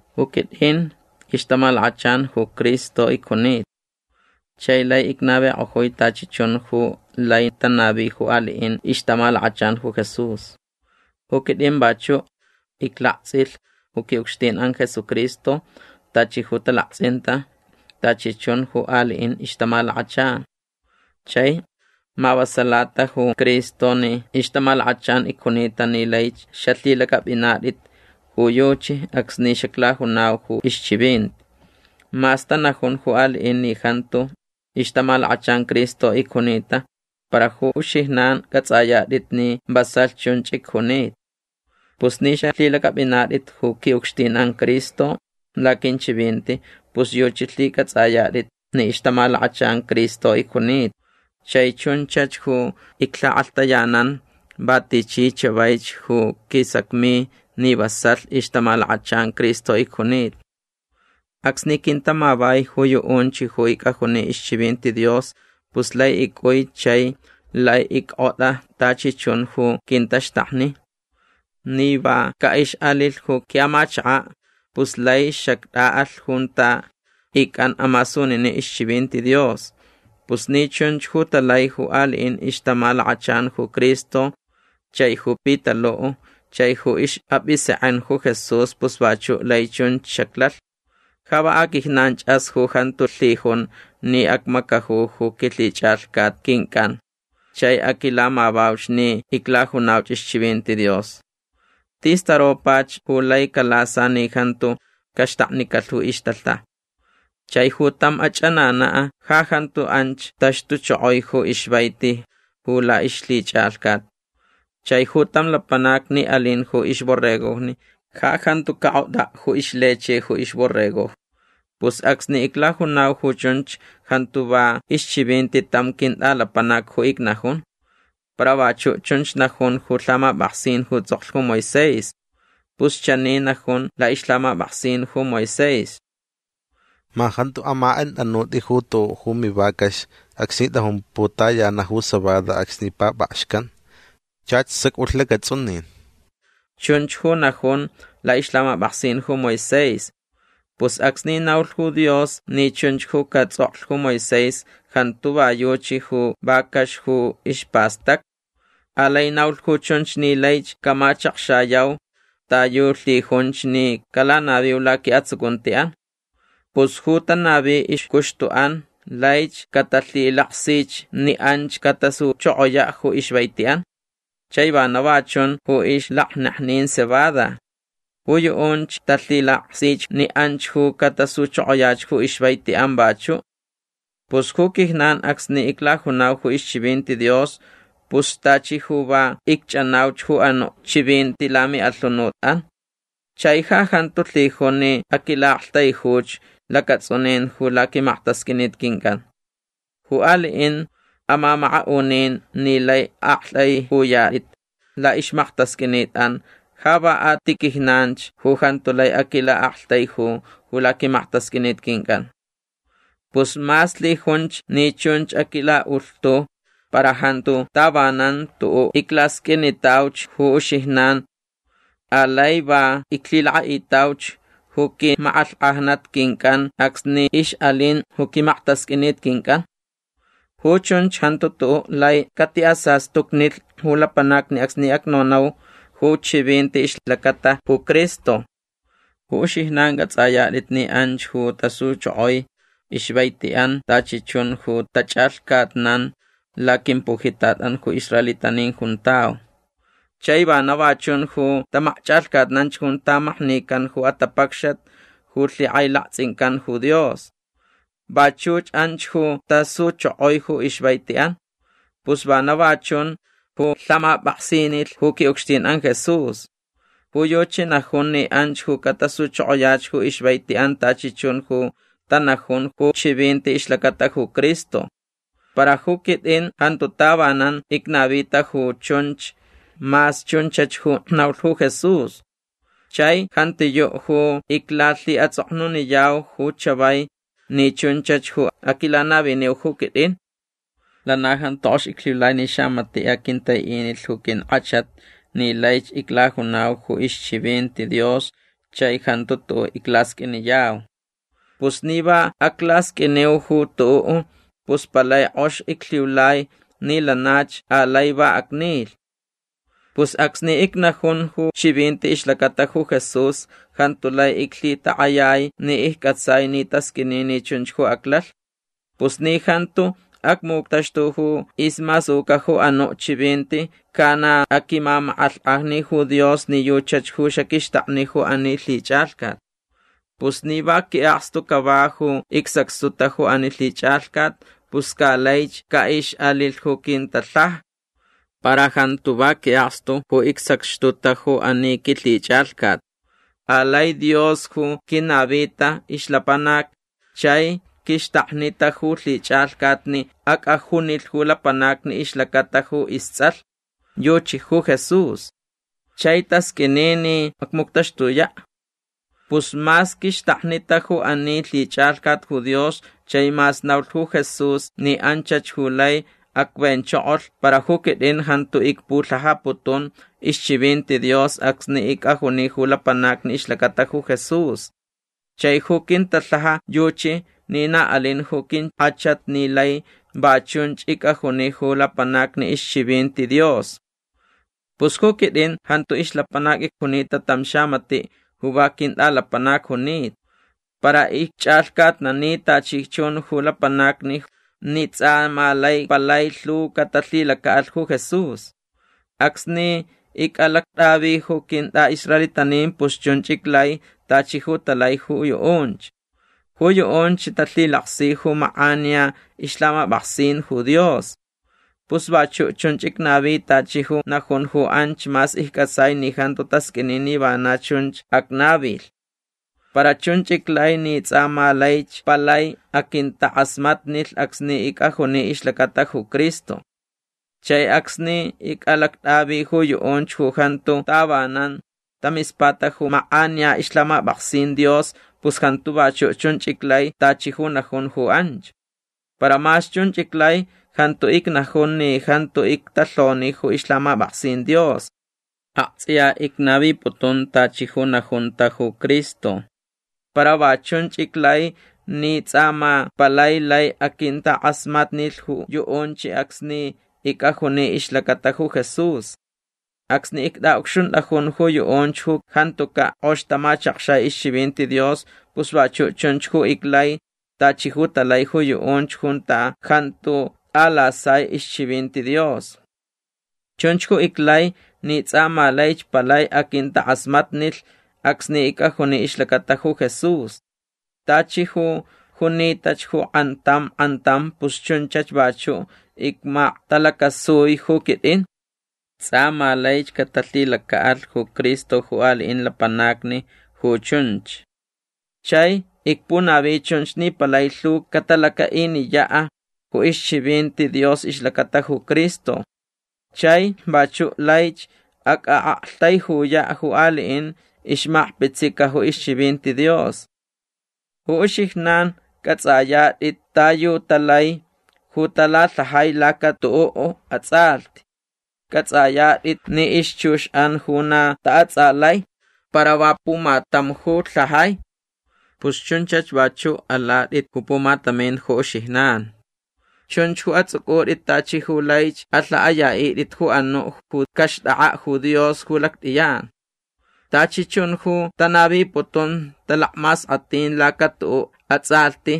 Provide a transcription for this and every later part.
Ju quitʼin ixtamalakachan ju Cristo icjunita. Chai lai icnavikʼojui tachi chun ju lai tanavi ju aliʼin ixtamalakachan ju Jesús. Ju quitʼin vachuʼ iclaktsʼilh ju quiʼucxtinʼan Jesucristo tachi ju talaktsʼinta tachi chun ju aliʼin ixtamalakachan. Chai mavasalata ju Cristo ni ixtamalakachan icjunita ni laich xalhilacʼapʼinatʼit ju yuchi acsni xaclajunau ju ixchivinti. Mas tanajun ju aliʼin ni jantu ixtamalakachan Cristo icjunita para ju uxijnan cʼatsʼayatʼit ni vasalh chunch icjunita. Pus ni xalhilacʼapʼinatʼit ju quiʼucxtinʼan Cristo laquinchivinti pus yuchi lhicʼatsʼayatʼit ni ixtamalakachan Cristo icjunita. Chai chunchach ju iclhakʼalhtayanan va tichi chavaich ju quisacmi ni vasalh ixtamalakachan Cristo icjunita. Acsni quintamavai ju yuʼunch ju icʼajuni ixchivinti Dios pus lai icʼui chai lai ickʼotʼa tachi chun ju quintaxtakni. Ni va caʼixʼalilh ju quiʼamachakaʼ pus lai xactʼaʼalh junta icʼan amasuninin ixchivinti Dios. Pus ni chunch ju talai ju aliʼin ixtamalakachan ju Cristo chai ju Pitaluʼ chai ju ixʼapʼisekʼen ju Jesús pus vachuʼ lai chunch xaclalh. Ja va aquijnanchʼas ju jantu lhijun ni acmacaju ju quilhichʼalhcat quincʼan chai aquilamavauch ni iclajunauch ixchivinti Dios. Tis taropach ju laich calasa ni jantu caxtaknicalh ju ixtalhaja. Chai ju tam achʼananaʼ ja jantu anch taxtuchokoi ju ixvaiti ju laʼixlhichʼalhcat. Chai ju tam lapanac ni alin ju ixborregojni ja jantu cakʼotʼaʼ ju ixleche ju ixborregojni. Pus acsni iclajunau ju chunch jantu va ixchivinti tam quintʼalapanac ju icnajun. Para vachuʼ chunch najun ju lhamapʼaksin ju tsʼoklh ju Moisés. Pus chani najun laʼixlhamapʼaksin ju Moisés: “Ma jantu amakʼenkʼatʼanutʼi ju tuʼuʼ ju mivacax acsni tʼajun putayanaʼ ju cebada acsni papʼakxcan. Chach sacʼulh lacatsʼunin”. Chunch ju najun laʼixlhamapʼaksin ju Moisés. Pus acsni naulh ju Dios ni chunch ju catsʼoklh ju Moisés jantu va yuchi ju vacax ju ispastacta. Alai naulh ju chunch ni laich camachakxayau ta yu lhijunch ni calanaviu laquiʼatsucuntiʼan. Pus ju tanavi ixcuxtuʼan laich catalhilaksich ni anch catasuchokoyaʼ ju ixvaitiʼan. Chai vana va chun ju ixlakneknin cebada. Ju yuʼunch talhilaksich ni anch ju catasuchokoyach ju ixvaitiʼan vachuʼ. Pus ju quijnan acsni iclajunau ju ixchivinti Dios pus tachi ju va icchʼanauch ju anuʼ chivinti lamiʼalhunutʼan. Chai ja jantu lhijun ni aquilaʼaktaijuch lacatsʼunin ju laquimaktasqʼuinit quincʼan. Ju aliʼin amamakaʼunin ni lai aktʼaiʼuyatʼit laʼixmaktasqʼuinitʼan ja va a ti quijnanch ju jantu lai aquintilaʼaktaiju ju laquimaktasqʼuinit quincʼan. Pus mas lhijunch ni chunch aquilaʼulhtu para jantu tavanan tuʼuʼ iclasqʼuinitauch ju uxijnan. Alai va iclhilakʼaʼitauch ju quimakʼalhkʼajnat quincʼan acsni ixʼalin ju quimaktasqʼuinit quincʼan. Ju chunch jantu tuʼuʼ lai catiʼasastucnilh ju lapanacni acsni acnonau ju chivinti ixlacata ju Cristo. Ju uxijnan cʼatsʼayatʼit ni anch ju tasuchokoi ixvaitiʼan tachi chun ju tachʼalhcatnan laquimpujitatʼan ju israelitanin juntau. Chai vana va chun ju tamakchʼalhcatnanch junta maknican ju atapacxat ju lhikʼailaktsʼincan ju Dios. Vachuch anch ju tasuchokoi ju ixvaitiʼan. Pus vana va chun ju lhamapʼaksinilh ju quiʼucxtinʼan Jesús. Ju yuchi najun ni anch ju catasuchokoyach ju ixvaitiʼan tachi chun ju tanajun ju chivinti ixlacata ju Cristo. Para ju quitʼin jantu tavanan icnavita ju chunch mas chunchach ju naulh ju Jesús. Chai jantiyuʼ ju iclalhiʼatsʼoknuniyau ju chavai ni chunchach ju aquilanaviniu ju quitʼin. Lana jantu kʼox iclhiulai ni xamatiʼ aquintaiʼinilh ju quinkʼachat ni laich iclajunau ju ixchivinti Dios chai jantu tuʼuʼ iclasqʼuiniyau. Pus ni va aclasqʼuiniu ju tuʼuʼ pus palai kʼox iclhiulai ni lanach alai va acnilh. Pus acsni icnajun ju chivinti ixlacata ju Jesús jantu lai iclhitakʼayai ni iccʼatsai ni tasqʼuini ni chunch ju aclalh. Pus ni jantu acmuctaxtu ju ismasuca ju anuʼ chivinti ca na aquimamakʼalhkʼajni ju Dios ni yuchach ju xaquixtakni ju ani lhichʼalhcat. Pus ni va quiʼakstu cava ju icsacxtuta ju ani lhichʼalhcat pus ca laich caʼixʼalilh ju quintalhaja. Para jantu va quiʼakstu ju icsacxtuta ju ani quilhichʼalhcat. Alai Dios ju quinavita ixlapanac chai quixtaknita ju lhichʼalhcat ni acʼajunilh ju lapanacni ixlacata ju istsʼalh. Yuchi ju Jesús. Chai tasqʼuini ni acmuctaxtuyaʼ. Pus mas quixtaknita ju ani lhichʼalhcat ju Dios chai mas naulh ju Jesús ni anchach ju lai acvenchokolh para ju quitʼin jantu icpulhajaputun ixchivinti Dios acsni icʼajuni ju lapanacni ixlacata ju Jesús. Chai ju quintalhaja yuchi ni na alin ju quinkʼachat ni lai va chunch icʼajuni ju lapanacni ixchivinti Dios. Pus ju quitʼin jantu ixlapanac icjunita tam xamatiʼ ju va quintʼalapanac junita. Para icchʼalhcatnani tachi chun ju lapanacni ni tsʼa ma lai palai lhu catalhilacaʼalh ju Jesús. Acsni icʼalactʼavi ju quintʼaʼisraelitanin pus chunch iclai tachi ju talai ju yuʼunch. Ju yuʼunch talhilaksi ju makʼaniya ixlhamapʼaksin ju Dios. Pus vachuʼ chunch icnavi tachi ju najun ju anch mas iccʼatsai ni jantu tasqʼuini ni vana chun acnavilh. Para chunch iclai ni tsʼa ma laich palai aquintakʼasmatnilh acsni icʼajuni ixlacata ju Cristo. Chai acsni icʼalactʼavi ju yuʼunch ju jantu tavanan tamispata ju makʼaniya ixlhamapʼaksin Dios pus jantu vachuʼ chunch iclai tachi ju najun ju anch. Para mas chunch iclai jantu icnajun ni jantu ictalhoni ju ixlhamapʼaksin Dios. Aktsʼiya icnaviputun tachi ju najunta ju Cristo. Para va chunch iclai ni tsʼa ma palai lai aquintakʼasmatnilh ju yuʼunch acsni icʼajuni ixlacata ju Jesús. Acsni ictʼaʼucxuntʼajun ju yuʼunch ju jantucaʼ kʼox tamachakxai ixchivinti Dios pus vachuʼ chunch ju iclai tachi ju talai ju yuʼunch junta jantu tʼalasai ixchivinti Dios. Chunch ju iclai ni tsʼa ma laich palai aquintakʼasmatnilh acsni icʼajuni ixlacata ju Jesús. Tachi ju junitach ju kʼantam kʼantam pus chunchach vachuʼ icmaktalacasui ju quitʼin. Tsʼa ma laich catalhilacaʼalh ju Cristo ju aliʼin lapanacni ju chunch. Chai icpunavi chunch ni palai lhu catalacaʼiniyaʼ ju ixchivinti Dios ixlacata ju Cristo. Chai vachuʼ laich acʼaʼaktaijuyaʼ ju aliʼin ixmakpitsica ju ixchivinti Dios. Ju uxijnan cʼatsʼayatʼit ta yu talai ju talalhajai laca tuʼuʼ atsʼalhti. Cʼatsʼayatʼit ni ixchuxʼan ju na taʼatsʼalai para va pumatam ju lhajai. Pus chunchach vachuʼ alatʼit ju pumatamin ju uxijnan. Chunch ju atsʼucʼutʼit tachi ju laich alhaʼayaʼitʼit ju anuʼ ju caxtʼakʼaʼ ju Dios ju lactʼiyan. Tachi chun ju tanaviputun talakmaskʼatin laca tuʼuʼ atsʼalhti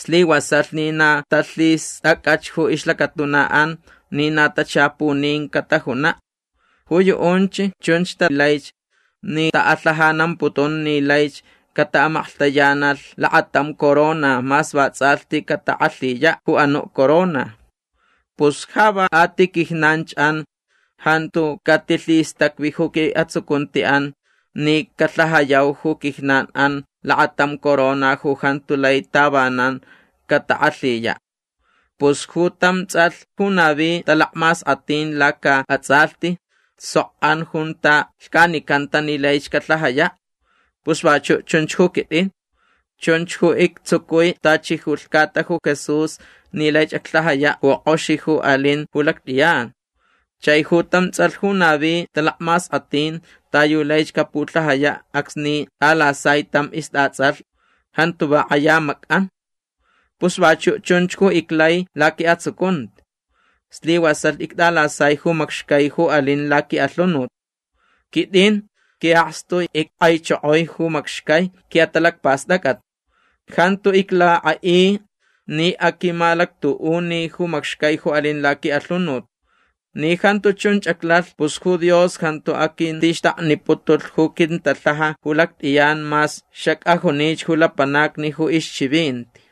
slivasalh ni na talhistʼacʼach ju ixlacatunaʼan ni na tachapunin catajunaʼ. Ju yuʼunch chunch talaich ni taʼalhajanamputun ni laich cataʼamaklhtayanalh lakatam corona mas vatsʼalhti catakʼalhiyaʼ ju anuʼ corona. Pus ja va a ti quijnanchʼan jantu catilhistacvi ju quiʼatsucuntiʼan ni calhajayau ju quijnanʼan lakatam corona ju jantu lai tavanan catakʼalhiyaʼ. Pus ju tam tsʼalh ju navi talakmaskʼatin lacaʼatsʼalhti sok an junta lhcanicanta ni laich calhajayaʼ. Pus vachuʼ chunch ju quitʼin. Chunch ju ictsucui tachi ju lhcata ju Jesús ni laich aclhajayaʼ ju kʼox ju alin ju lactʼiyan. Chai ju tam tsʼalh ju navi talakmaskʼatin ta yu laich capulhajayaʼ acsni tʼalasai tam istʼatsʼalh jantu va kʼaya macʼan. Pus vachuʼ chunch ju iclai laquiʼatsucunti. Slivasalh ictʼalasai ju macxcai ju alin laquiʼalhunut. Quitʼin quiʼakstu ickʼaichokoi ju macxcai quiʼatalacpastʼacʼat. Jantu iclakʼaʼi ni aquimalactuʼuni ju macxcai ju alin laquiʼalhunut. Ni jantu chun aclalh pus ju Dios jantu aquintixtakniputulh ju quintalhaja ju lactʼiyan mas xacʼajunich ju lapanacni ju ixchivinti.